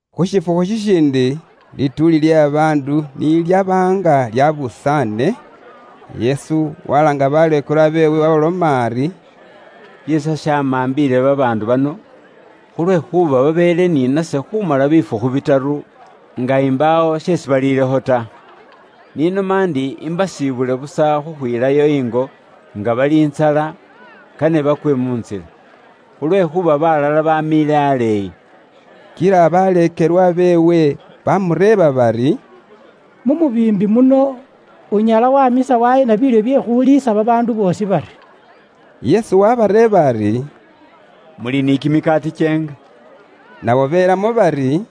Khu shifukhu shishindi, lituuli lye babaandu ni lyaba nga lyabusaane, Yesu walaanga baleekelwa beewe, waabaloma ari, “Shiisa shamambiile babaandu bano, khulwekhuuba babeele ni nase khumala bifukhu bitaru, nga imbaawo sheesi baliilekho ta. Ise n'inoma ndi imbasibule busa khukhwilayo ingo nga bali ntsala, kane bayekhelele bakwe mu ntsila. Khulwekhuuba balala bamiile aleeyi.” Kila baleekelwa beewe bamureeba bari, “Mu mubiimbi muno unyala wamisa waheena biilyo bye khuliisa babaandu boosi bari?” Yesu wabareeba ari, “Muli ni kimikaati kyeenga?” Nabo belamo bari,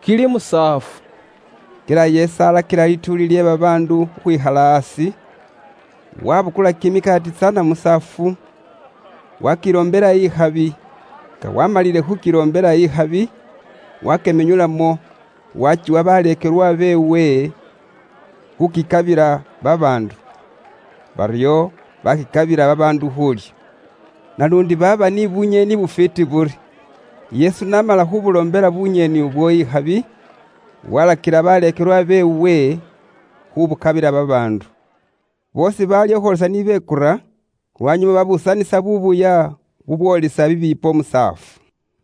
“Kili musaafu.” Kila Yesu alakila lituuli lye babaandu khukhwikhala aasi; wabukula kimikaati tsana musaafu, wakiloombela ikhabi. Nga waamalile khukiloombela ikhabi, wakimenyulamo wakiwa baleekelwa beewe khukikabila babaandu. Baryo bakikabila babaandu khuulya. Naluundi baaba ni bunyeeni bufwiiti buri. Yesu n'amala khubuloombela bunyeeni ubwo ikhabi, walakila baleekelwa beewe khubukabila babaandu. Boosi baalya khukhwoolisa ni bekura; lwanyuma babuusanisa buubuya bubwoolisa bibiipo musaafu.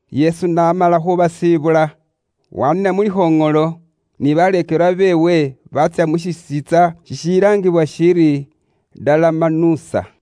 Yesu n'amala khuubasibula, waaniina mu likhoŋolo ni baleekelwa beewe baatsya mu shisiintsa shishilaangibwa shiri Dalamanusa.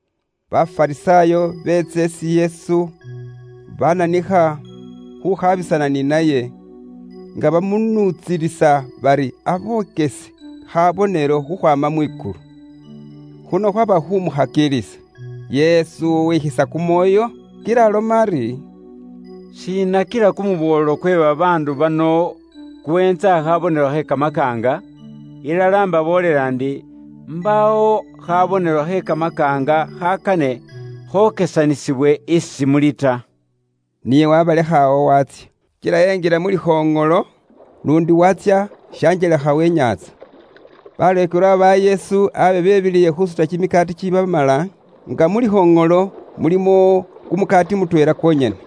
Bafarisaayo beetsa isi Yesu bananikha khukhabisana ni naye, nga bamunuutsilisa bari abokese khabonelo khukhwaama mwikulu. Khuno khwaba khumukhakilisa. Yesu wekhiliisa kumwoyo kila aloma ari, “Shiina kila kumuboolo kwe babaandu bano, kuweentsa she khabonelo khe kamakaanga? Ilala imbaboolela ndi, imbaawo khabonelo khe kamakaanga khakane khokesanisibwe isi muli ta.” Niye wabalekha awo waatsya. Kila enjila mu likhoŋolo luundi waatsya shanjelekha we nyaantsa. Baleekelwa ba Yesu abe bebiliile khuusuta kimikaati kikiibamala, nga mu likhoŋolo mulimo kumukaati mutweela kwonyene.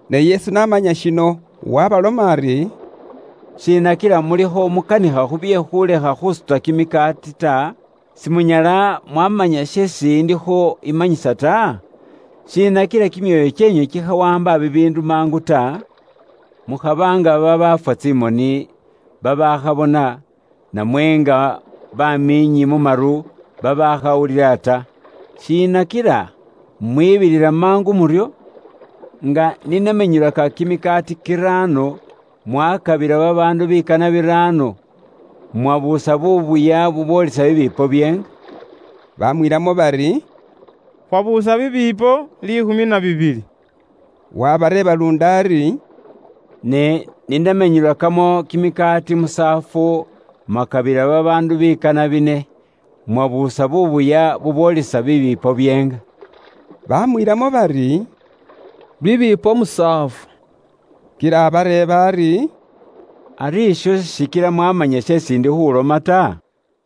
Ne Yesu n'amanya shino waabaloma ari, “Shiina kila mulikho mukanikha khu bye khulekha khusuta kimikaati ta? Simunyala mwamanya sheesi indikho imanyisa ta? Shiina kila kimyoyo kyeenywe kikhawaamba bibiindu mangu ta? Mukhaba nga babafwa tsimoni babaakhabona, namwe nga bamiinyi mu maru babaakhawulila ta. Shiina kila mwibilila mangu muryo? Nga ni namenyulaka kimikaati kiraano mwakabila babaandu bikana biraano, mwabuusa buubuya bubwolisa bibiipo byeenga?” Baamwiilamo bari, “Khwabuusa bibiipo liikhumi na bibili.” Waabareeba luundi ari, “Ne ni namenyulakamo kimikaati musaafu mwaakabila babaandu bikana bine, mwabuusa buubuya bubwoolisa bibiipo byeenga?” Bamwiilamo bari, “Bibipo musaafu.” Kila abareeba ari, “Ari isho sishikila mwaamanya sheesi indi khuulomakho ta?”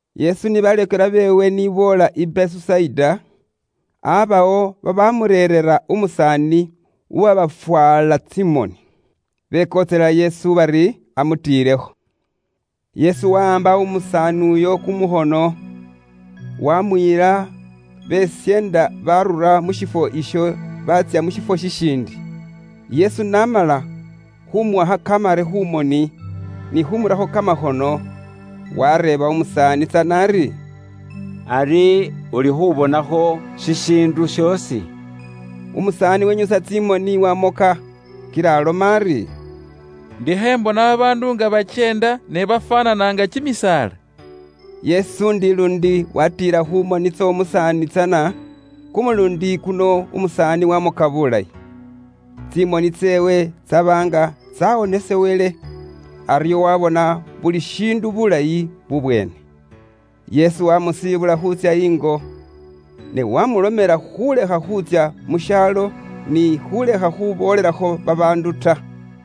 Yesu ni baleekelwa beewe ni boola i Besusaida, aabawo babaamureerera umusaani uwabofwaala tsimoni. Bekontselela Yesu bari amutiilekho. Yesu wahaamba umusaani uyo kumukhono, waamuyila besyeenda baarura mu shifwo isho baatsya mu shifo shishiindi. Yesu n'amala khuumuwakha kamare khu moni, ni khuumurakho kamakhono, waareeba umusaani tsana ari, “Ari ulikho ubonakho shishiindu shoosi?” Umusaani wenyusa tsimoni waamoka, kila aloma ari, “Indikho imbona babaandu nga bakyeenda, ne bafwaanana nga kimisaala.” Yesu indi luundi waatiila khu moni tsy'omusaani tsana; kumuluundi kuno umusaani waamoka buulayi. Tsimoni tseewe tsaaba nga tsawonesebwele, aryo waabona buli shiindu buulayi bubweene. Yesu waamusiibula khuutsya ingo, ne waamulomela khuulekha khutsya mu shaalo ni khuulekha khuboolelakho babaandu ta.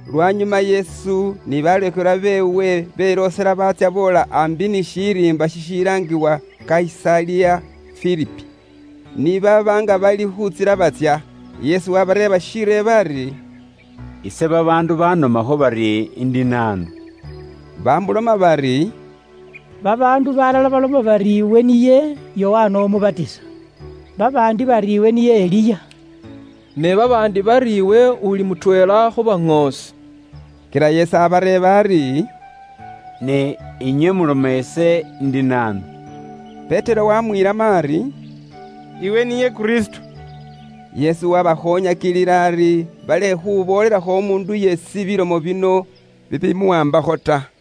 Lwanyuma Yesu ni baleekelwa beewe beloosela baatsya boola aambi ni shiriimba shishilaangibwa Kayisaliya Filipi. Ni baaba nga bali khu ntsila batsya, Yesu wabareeba shireebo ari, “Ise babaandu banomakho bari indi naanu?” Baamuloma bari, “Babaandu balala baloma bari iwe niye Yokana Umubatisa; babaandi bari iwe niye Eliya; ne babaandi bari iwe uli mutweela khu baŋoosi.” Kila Yesu abareeba ari, “Ne inywe muloma ise indi naanu?” Petero waamwiilamo ari, “Iwe niye Kristo.” Kristo shimanyisa shiri “Umuwonesi.” Yesu waabakhoonyakilila ari balekhe khuboolelakho umuundu yeesi bilomo bino bibimuwaambakho ta.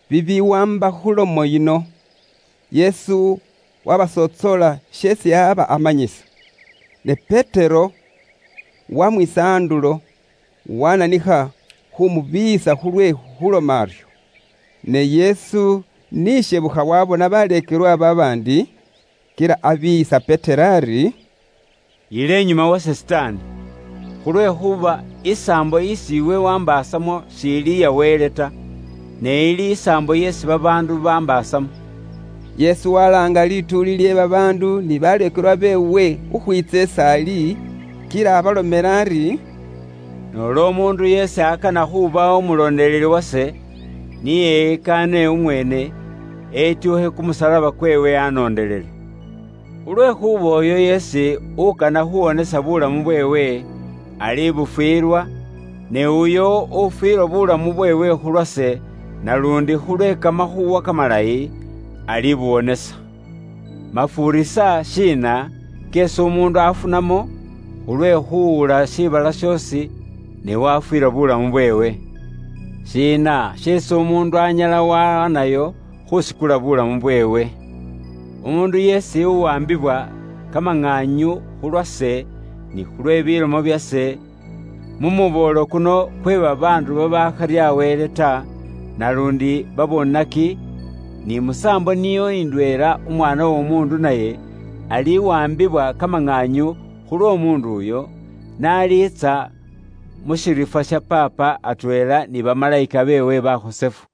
Bibiwaamba khu lomo yino, Yesu wabasontsoola sheesi aba amanyisa. Ne Petero wamwisa andulo wananikha khumubiiyisa khulwe khuloma aryo. Ne Yesu ni ishebukha waabona baleekelwa babaandi, kila abiiyisa Petero ari, “Yiila inyuma wase Sitaani! Khulwekhuuba isaambo isi iwe waambaasamo shiili iya Wele ta, ne ili isaambo yeesi babaandu bambaasamo.” Yesu walaanga lituuli lye babaandu ni baleekelwa beewe khukhwiitsa is'ali, kila abalomela ari, “Noola umuundu yeesi akana khuuba umulondeleli wase, ni eyikaane umweene, etyuukhe kumusalaba kweewe anoondelele. Khulwekhuuba uyo yeesi ukana khuuwonesa buulamu bweewe, alibufwilwa; ne uyo ufwilwa buulamu bweewe khulwase naluundi khulwe Kamakhuuwa Kamalayi, alibuwonesa, Mafuurisa shiina keesi umuundu afunamo, khulwe khuwula shiibala shoosi, ne wafwiilwa buulamu bweewe? Shiina sheesi umuundu anyala wahaanayo khuusikula buulamu bweewe? Umuundu yeesi uwaambibwa kamaŋaanyu khulwase ni khulwe bilomo byase, mu muboolo kuno kwe babaandu babaakharya Wele ta, naluundi babonaki, ni musaambo niyo indweela Umwaana w'Omuundu naye aliwaambibwa kamaŋaanyu khulw'omuundu uyo, n'aliitsa mu shiriifwa sha Paapa, atweela ni bamalayika beewe bakhosefu.”